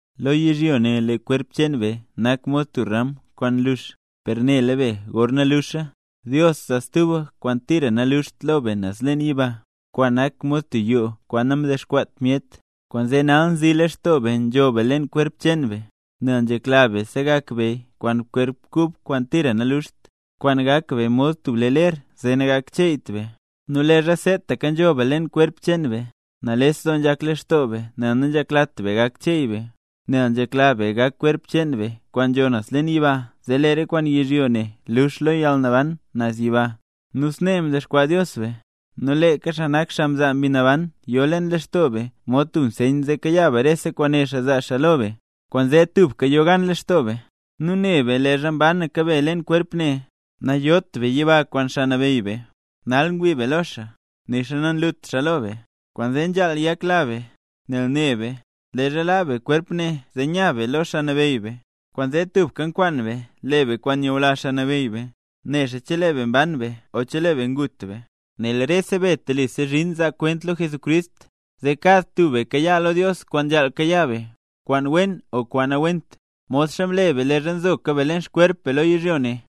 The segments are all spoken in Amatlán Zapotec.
Lo yizhyo ne lee kwerp cheen be nak mod tub ramad kwaan nlux. Per nela be gorna luxa, Dios zaa stuba kwaan tira naluxt lo be naz leen yiba, kwaan nak mod tub yoo kwaan namdexkwaat myet. Kwaanzee nal nzilextoo be nzho be leen kwerp cheen be, nel nzhekla be segak be be kwaan kwerp kub kwaan tira naluxt, kwaan gak be mod tub ler zee nagakcheeyt be. Nu leezha seetaka nzho be leen kwerp cheen be, nales doo nzhak lextoo be nel nanzheklat be gak cheey be, nel nzhekla be gak kwerp cheen be kwaan nzho naz leen yiba zee lee re kwaan yizhyo ne lux lo yalnaban naz yiba. Nu snee mdexkwaa Dios be, nu leeka xaa nak xaa mzaa Mbi Naban yo leen lextoo be mod tub nseyn zee kayaa be re kwaan né xaa zaa xaa lo be. Kwaanzee tubka yo gan lextoo be. Nu ne be leezha mbanaka be leen kwerp ne, nayot be yiba kwaan Xaa Nabeyy be. Nal ngwii be lo xaa, nixa nanyunt xaa lo be. Kwaanzee nzhaal yakla be, nel ne be, leezha laa be kwerp ne zee nya be lo Xaa Nabeyy be. Kwaanzee tubka nkwaan be le be kwaan nyula Xaa Nabeyy be, nexa chelee be mban be o chelee be ngut be. Nel rese be telisa zhin zaa kwent lo Jesucrist, zee kad tub be kayaa lo Dios kwaan nzhaal kayaa be, kwaan wen o kwaan nawent, modxa mle be leezha nzoka be leen xkwerp be lo yizhyo ne.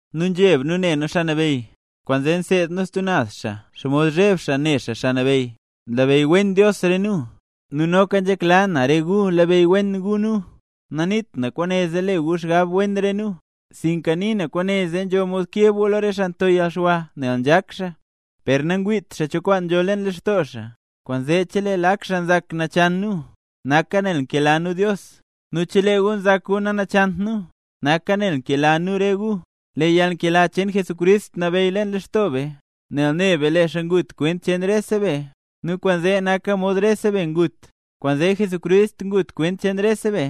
Nu nzheb nu ne nu Xaa Nabeyy, kwaanzee nseed nu stub naz xaa xomod zheb xaa ne xaa Xaa Nabeyy. Nlabeyy wen Dios re nu, nu nzhekla na noka re gu labeyy wen gu nu. Naniit na kwaane zee le gu xgab wen re nu, sinka nii na kwaane zee nzho mod keb gu lo re xaa nto yalxwa nel nzhak xaa, per nangwiit xaa cho kwaan nzho leen lextoo xaa. Kwaanzee chelee lak xaa nzak nachan nu, naka nel nkela nu Dios; nu chelee gu nzak gu nanachant nu, naka nel nkela nu re gu. Lee yalnkela cheen Jesucrist nabeyy leen lextoo be, nel ne be lee xaa ngut kwent cheen rese be, nu kwaanzee naka mod rese be ngut. Kwaanzee Jesucrist ngut kwent cheen rese be,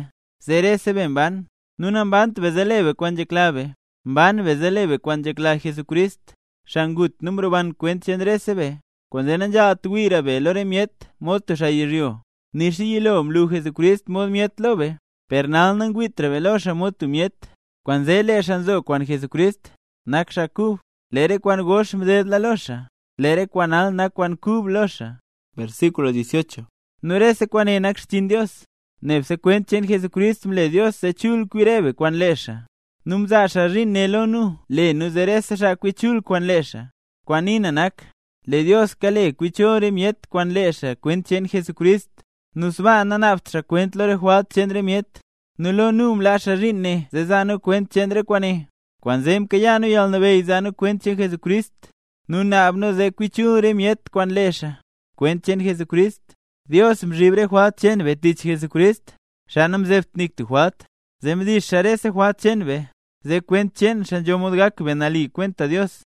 zee rese be mban; nu nambant be zee le be kwaan nzhekla be; mban be zee le be kwaan nzhekla Jesucrist, xaa ngut nu mroban kwent cheen rese be. Kwaanzee nanzhaalt wiira be lo re myet mod tub xaa yizhyo, nixa yilo mlu Jesucrist mod myet lo be, per nal nangwiitra be lo xaa mod tub myet. Kwaanzee lee xaa nzo kwaan Jesucrist, nak xaa kub. Lee re kwaan gox mdedla lo xaa, lee re kwaan nal nak kwaan kub lo xaa. Nu rese kwaane nak xchiin Dios. Nebse kwent cheen Jesucrist mle Dios zee chul kwi re be kwaan lee xaa. Nu mzaa xaa zhiin ne lo nu le nu zee rese xaa kwi chul kwaan lee xaa. Kwaan nii na nak, lee Dios kale kwi chul re myet kwaan lee xaa kwent cheen Jesucrist, nu sbaa nanaabt xaa kwent lo re jwalt cheen re myet, nu lo nu mlaa xaa zhiin ne zee zaa nu kwent cheen re kwaane. Kwaanzee mkayaa nu yalnabeyy zaa nu kwent cheen Jesucrist; nu naab nu zee kwi chul rese myet kwaan lee xaa, kwent cheen Jesucrist. Dios mzhib rese jwalt cheen be tich Jesucrist, xaa namzeebt nik tub jwalt, zee mdix xaa rese jwalt cheen be, zee kwent cheen xaa nzho mod gak be nali kwenta Dios.